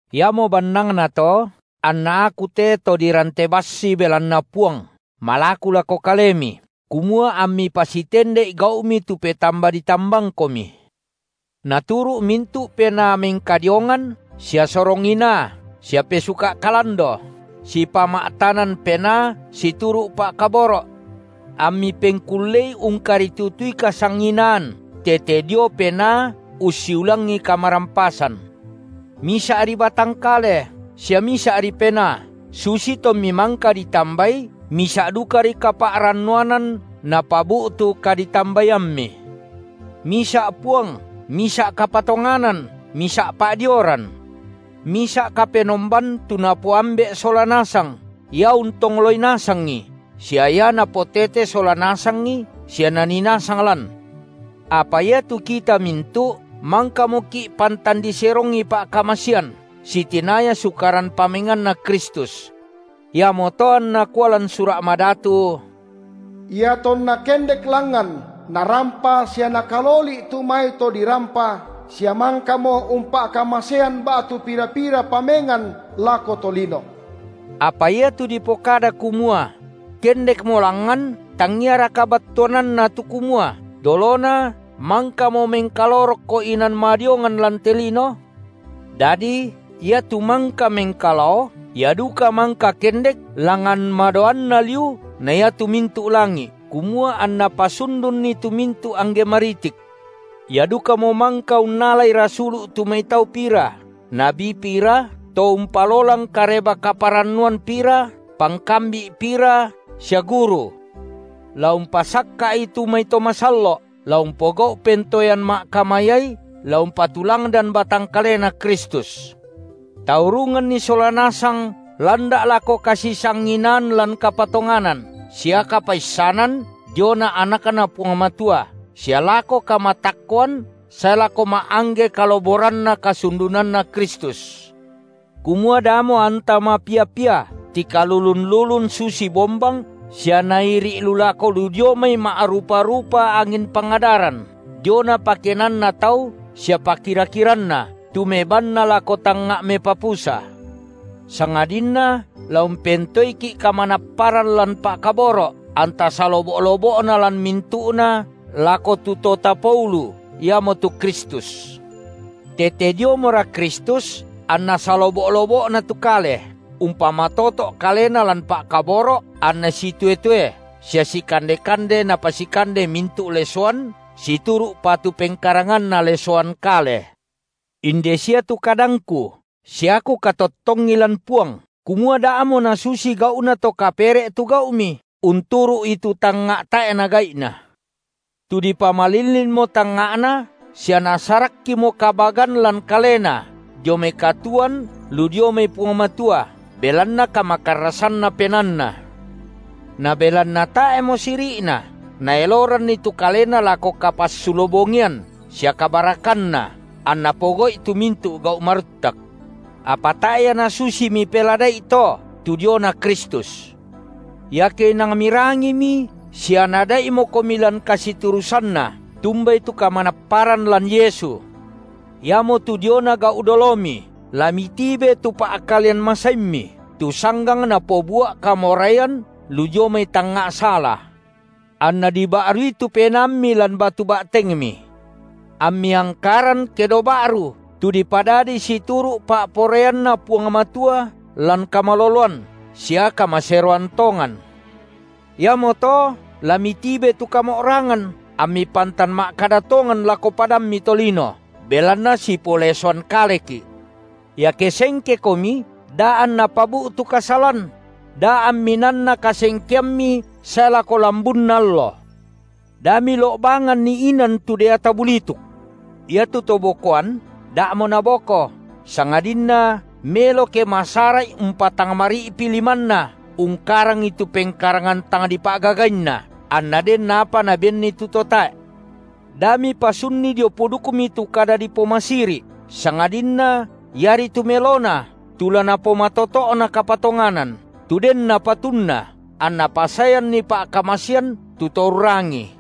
Iamo bannangnato, anna aku te to dirante bassi belanna Puang malaku lako kalemi, kumua ammi pasitende’i gau’mi tu petamba ditambangkomi. Naturu’ mintu’ penaa mengkadiongan sia sorong inaa sia pesuka’ kalando, sipama’tanan penaa situru’ pa’kaboro’. Ammi pengkullei ungkaritutui kasisanginaan tete dio Penaa ussiulangi kamarampasan; misa’ri batang kale sia misa’ri Penaa, susi tommi mangka ditambai misa’ dukari kapa’rannuanan napabu’tu kadi- tambaiammi; misa’ Puang, misa’ kapatonganan, misa’ pa’dioran, misa’ Kapenomban tu napoAmbe’ sola nasang, Ia untongloi nasangi sia Ia napotete sola nasangi sia Nanii nasang lan. Apa iatu kita mintu’ mangkamoki’ pantan diserongi pa’kamasean, sitinaya sukaran pamenganNa Kristus. Iamoto anna kua lan Sura’ Madatu: Iatonna kendek langngan Narampa sia Nakaloli’ tu mai to dirampa, sia mangkamo umpa’kamasean ba’tu pira-pira pamengan lako tolino. Apa iatu dipokada kumua: Kendekmo langngan, tangiaraka battuananna tu kumua, dolona mangkamo mengkalao rokko inan madiongan lan te lino? Dadi Ia tu mangka mengkalao, Ia duka mangka kendek langngan madaoanna liu na iatu mintu’ langi’, kumua anna pasundunni tu mintu’ angge maritik. Ia dukamo mangka unnalai rasulu’ tu mai tau pira, nabi pira, to umpalolang Kareba-kaparannuan pira, pangkambi’ pira sia guru, la umpasakka’i tu mai to masallo’, la umpogau’ pentoean ma’kamayai, la umpatulangdan batang kaleNa Kristus, taurunganni sola nasang landa’ lako kasisanginaan lan kapatonganan sia kapaissanan diona AnakNa Puang Matua sia lako kamatakkoan sae lako ma’angge kaloboranna kasundunanNa Kristus, kumua damo anta mapia-pia tikalulun-lulun susi bombang sia nairi’ lu lako lu dio mai ma’rupa-rupa angin pangadaran, diona pakenanna tau sia pakira-kiranna, tu mebanna lako tangnga’ mepapusa, sangadinna la umpentoeiki’ kamanapparan lan pa’kaboro’ anta salobo’-lobo’na lan mintu’na lako tu To tapoulu, iamotu Kristus. Tete diomora Kristus anna salobo’-lobo’na tu kale, umpamatoto’ kalena lan pa’kaboro’ anna sitoe-toe sia sikande-kande napasikande mintu’ lesoan situru’ patu pengkaranganna lesoan kale. Inde sia tu kadangku sia kukatottongi lan Puang, kumua da’mo nasusi gau’na to kapere’ tu gau’mi, unturu’i tu tangnga’ tae’na gai’na, tu dipamalillinmo tangnga’na sia nasarakkimo kabagan lan kalena dio mai katuoan lu dio mai Puang Matua, belanna kamakarrasanna penaanna. Na belanna tae’mo siri’na, naeloranni tu kalena lako kapassulo-bongian, sia kabarakanna anna pogau’i tu mintu’ gau’ maruttak. Apa tae’ ia nasusi mipelada’i to tu diona Kristus. Iake inang mirangimi sia Naada’imokomi lan kasiturusanNa tumbai tu kamanapparan lan Yesu, iamotu diona gau’ dolomi, la mitibe tu pa’kalean masaimmi, tu sanggang napobua’ kamoraian lu dio mai tangnga’ sala, anna diba’rui tu penaammi lan batu ba’tengmi, ammi angkaran kedo ba’ru, tu dipadadi situru’ pa’poraianNa Puang Matua lan kamaloloan sia kamaseroan tongan. Iamoto la mitibe tu kamo’rangan, ammi pantan ma’kada tongan lako padammi tolino, belanna sipolesoan kaleki’. Iake sengkekomi, da anna pabu’tu kasalan; da ammi nanna kasengkeammi sae lako lambunna allo. Da milo’banganni inan tu deata bulituk. Iatu to bokoan, da’mo naboko, sangadinna melo ke masara’i umpatangmari’pi limanna ungkarangi tu pengkarangan tang dipa’gagainna, anna den apa nabenni tu to tae’. Da mipasunni dio pudukmi tu kada dipomasiri’, sangadinna iari tu melona tu la napomatoto’na kapatonganan, tu denna patunna, anna pasaeanni pa’kamasean tu to urrangii.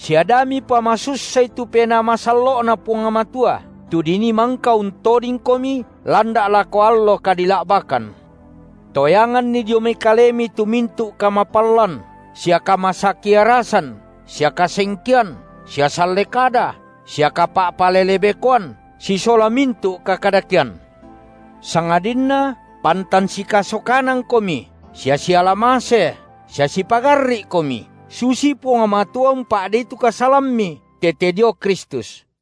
Sia da mipamasussai tu Penaa Masallo’Na Puang Matua, tu dinii mangka untodingkomi landa’ lako allo kadila’bakan. Toyanganni dio mai kalemi tu mintu’ kamapallan, sia kamasakiarasan sia kasengkean sia salle kada sia kapa’palelebekoan sisola mintu’ kakadakean. Sangadinna pantan sikasokanangkomi sia siala mase, sia sipagarri’komi, susi Puang Matua umpa’dei tu kasalammi tete dio Kristus.